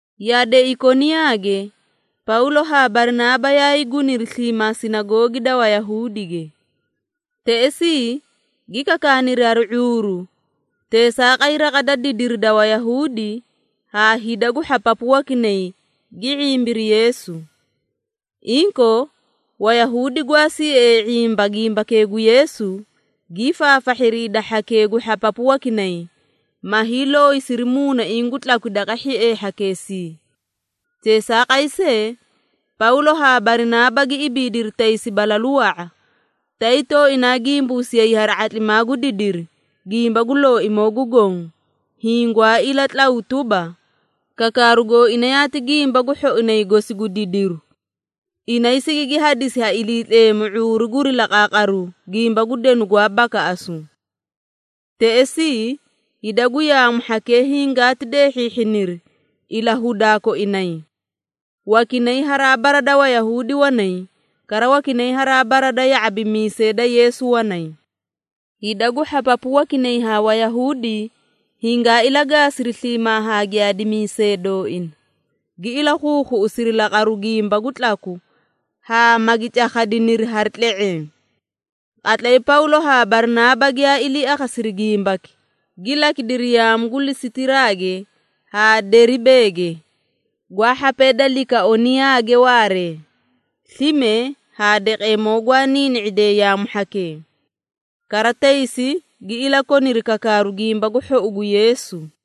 Yade Ikoniyaage Pawlo haa Barinaaba yaay guniri sliimaa sinagoogi da Wayahuudige. Teꞌesii gi kakaaniri hari ⁄uuru, teesaaqay raqa da didiri da Wayahuudi haa hida gu hhapapu wakinay gi ⁄imbiri Yeesu. Inkoo, Wayahuudi gwaa siee ⁄imba gimbakee gu Yeesu, gii faafahhiri hida hhakee gu hhapapu wakinay, ma hiilooyisiri muunaiĩ gu tlakwi daqa hhiee hhakeesii. Teesaaqay see, Pawlo haa Barinaaba gi ibiidiri taysi balalu wa⁄a, tay tooinaa gimbuusiyay hari ⁄atlimaa gu didiri gimba gu Looimoo gu Goõ, hiĩ gwaa ilatlaw tuba, kakaaru gooina yaati gimba gu hhoinay gosi gu didiru. Inay sigigi hadisi ha Iliitleemu ⁄uuru guri laqaaqaru gimba gu denu gwaa bakaꞌasu. Teꞌesii hida gu yaamu hhakee hingaati deehhiihhiniri ilahudaa koinay. Wakinay haraa bara da Wayahuudi wanay, kara wakinay haraa bara da ya⁄abimiisee da Yeesu wanay. Hida gu hhapapu wakinay haa Wayahuudi hingaa ilagaasiri sliimaa haa giyaadimiisee dooina, gi ilakhuukhuꞌusiri laqaraa gimba gu tlaku haa magi cakhadiniri hari tle⁄eẽ. Qatlay Pawlo haa Barinaaba giyaa ilii akhasiri gimbaki, gi lakidiri yaamu gu Lisitiraage haa Deribeege, gwaa hhapee da Likaoniyaage waaree, slime haa daqeemoo gwaa niini⁄idee yaamu hhakee. Kara taysi, gi ilakoniri kakaaru Gimba gu Hhou gu Yeesu.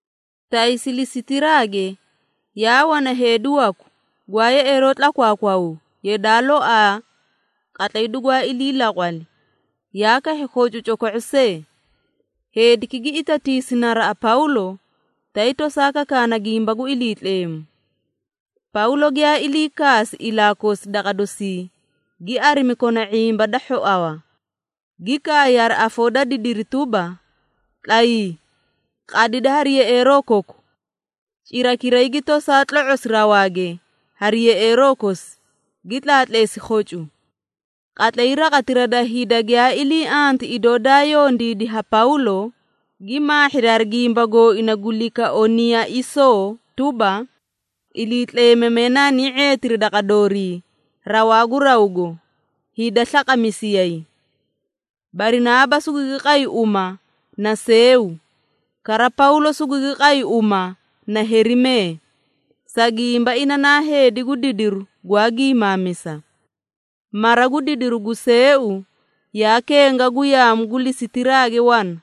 Taysi Lisitiraage, yaa wana heedi waku, gwaa yeꞌeeroo tlakwaakwaw, yadaa loaa qatlay dugwaa ilii laqwali, yaa kahhi khocu coko⁄o see. Heediki gi itatiisi naraꞌa Pawlo, tay tosaa kakaana gimba gu Iliitleemu. Pawlo giyaa ilii kaasi ilaa kosi daqa dosii, gi arimi kona ⁄imba da hhoawa, gi kaay hari afoo da didiri tuba, “Tlayii, qadidi hari yeꞌeeroo koku!” Cirakiray gi tosaa tlo⁄osi rawaage hari yeꞌeeroo kosi, gi tlaatleesi khocu. Qatlay raqatira da hida giyaa ilii anti idoo daa yondiidi ha Pawlo, gi maahhiri hari gimba gooina gu Likaoniiyaisoo tuba, “Iliitleemamee naani ⁄eetiri daqa doorii rawaa gu rawgo, hida slaqamisiyay!” Barinaaba sugugi qay uma na Seeu, kara Pawlo sugugi qay uma na Herimee, sa gimba ina naa heedi gu didiru gwaa gimaamisa. Mara gu didiru gu Seeu, yaa kenga gu yaamu gu Lisitiraage wana,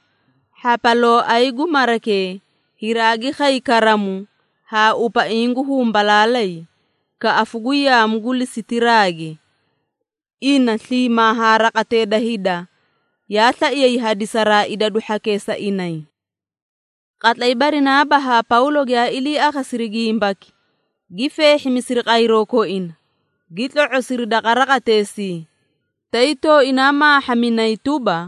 hhapalooay gu marakee hiraagi khay karamu haa upaiĩ gu humbalaalay kaꞌafu gu yaamu gu Lisitiraage. Ina sliimaa haa raqatee da hida yaa slaiyay hadisaraa idadu hhakee sa inay. Qatlay Barinaaba haa Pawlo giyaa ilii akhasiri gimbaki, gi feehhimisiri qayroo koina, gi tlo⁄osiri daqa raqateesii, tay tooinaa maahhaminay tuba,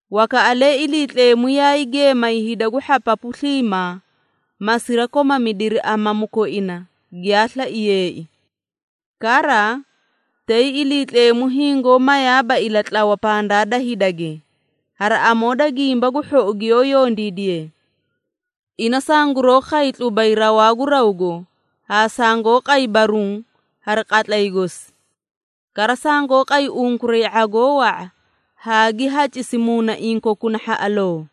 Wakaꞌalee Iliitleemu yaay geemay hida gu hhapapu sliimaa, ma sirakomamidiri amamu koina giyaa slaiyeei. Kara tay, Iliitleemu hingoó mayaaba ilatlawa pandaa da hidage, hari amoo da gimba gu hhou giyoó yondiidiye. Ina sanguroo khay tlubay rawaa gu rawgo haa sangoó qay baruũ hari qatlay gosi. Kara sangoó qay unkuray ⁄agoo wa⁄a haa gi hacisi muunaiĩ kokuna hhaꞌaloo!”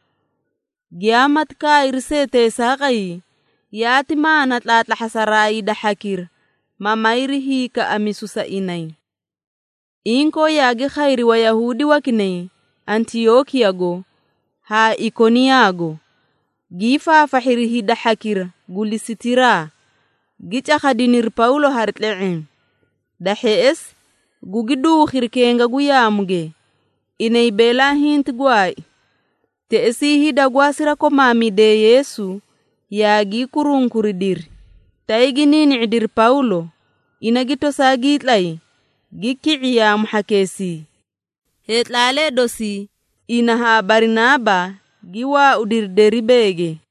Giyaamati kaayri see teesaaqay, yaati maana tlaatlahhasaraa hida hhakira, ma mayri hiikaꞌamisu sa inay. Inkoo yaagi khayri Wayahuudi wakinay Antiyookiyago haa Ikoniyaago, gii faafahhiri hida hhakira gu Lisitiraa, gi cakhadiniri Pawlo hari tle⁄eẽ. Da hheꞌesi gugi duukhiri kenga gu yaamuge, inay beelaa hinti gwaai. Teꞌesii hida gwaa sirakomaamidee Yeesu, yaagii kurunkuridiri, tay gi niini⁄idiri Pawlo, ina gi tosaa gii tlay, gi ki⁄i yaamu hhakeesii. Heetlaalee dosii ina haa Barinaaba gi waaudiri Deribeege.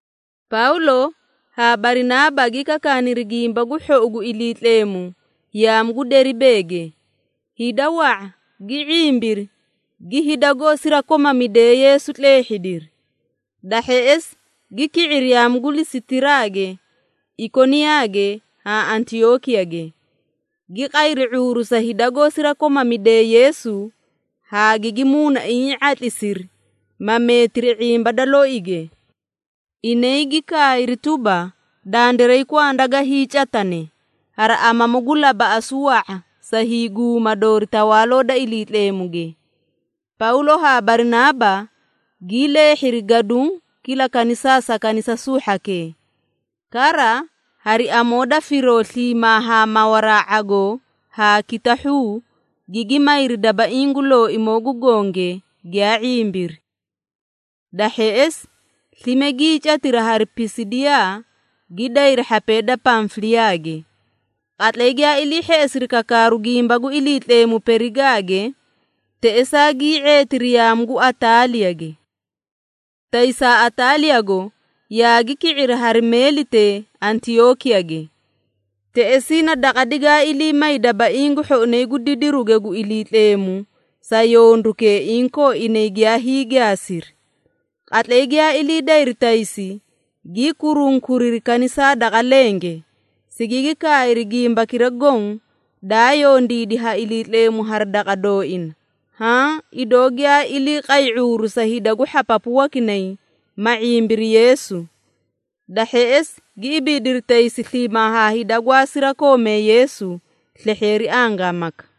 Pawlo haa Barinaaba gi kakaaniri Gimba gu Hhou gu Iliitleemu yaamu gu Deribeege. Hida wa⁄a, gi ⁄imbiri, gi hida goó sirakomamidee Yeesu tleehhidiri. Da hheꞌesi gi ki⁄iri yaamu gu Lisitiraage, Ikoniyaage haa Antiyookiyage, gi qayri ⁄uuru sa hida goó sirakomamidee Yeesu haa gigi muunaiĩ ⁄atlisiri, ma meetiri ⁄imba da louge. Inay gi kaayri tuba, “Dandiray kwanda ga hiicatane hari amamu gu labaꞌasu wa⁄a sa hiiguma doori Tawaaloo da Iliitleemuge.” Pawlo haa Barinaaba gii leehhiri gaduũ kila kanisaa sa kanisasuu hhakee. Kara hari amoo da firoo sliimaa haa mawaraa ⁄agoo haa kitahhuu, gigi mayri dabaiĩ gu Looimoo gu Gonge giyaa ⁄imbiri. Da hheꞌesi, slime gii catiri hari Pisidiyaa, gi dayri hhapee da Pamfiliyaage. Qatlay giyaa ilii hheꞌesiri kakaaru gimba gu Iliitleemu Perigaage, teꞌesaa gii ⁄eetiri yaamu gu Ataaliyage. Taysaa Ataaliyago yaagi ki⁄iri hari meelitee Antiyookiyage. Teꞌesii na daqa digaa ilii may dabaiĩ gu hhoinay gu didirige gu Iliitleemu sa yondukee inkoo inay giyaa hiigaasiri. Qatlay giyaa ilii dayri taysi, gii kurunkuriri kanisaa daqa lenge, sigigi kaayri gimbakira goõ daa yondiidi ha Iliitleemu hari daqa dooina, haã idoo giyaa ilii qay ⁄uuru sa hida gu hhapapu wakinay ma ⁄imbiri Yeesu. Da hheꞌesi gi ibiidiri taysi sliimaa haa hida gwaa sirakoomee Yeesu slehheeri angaamaka.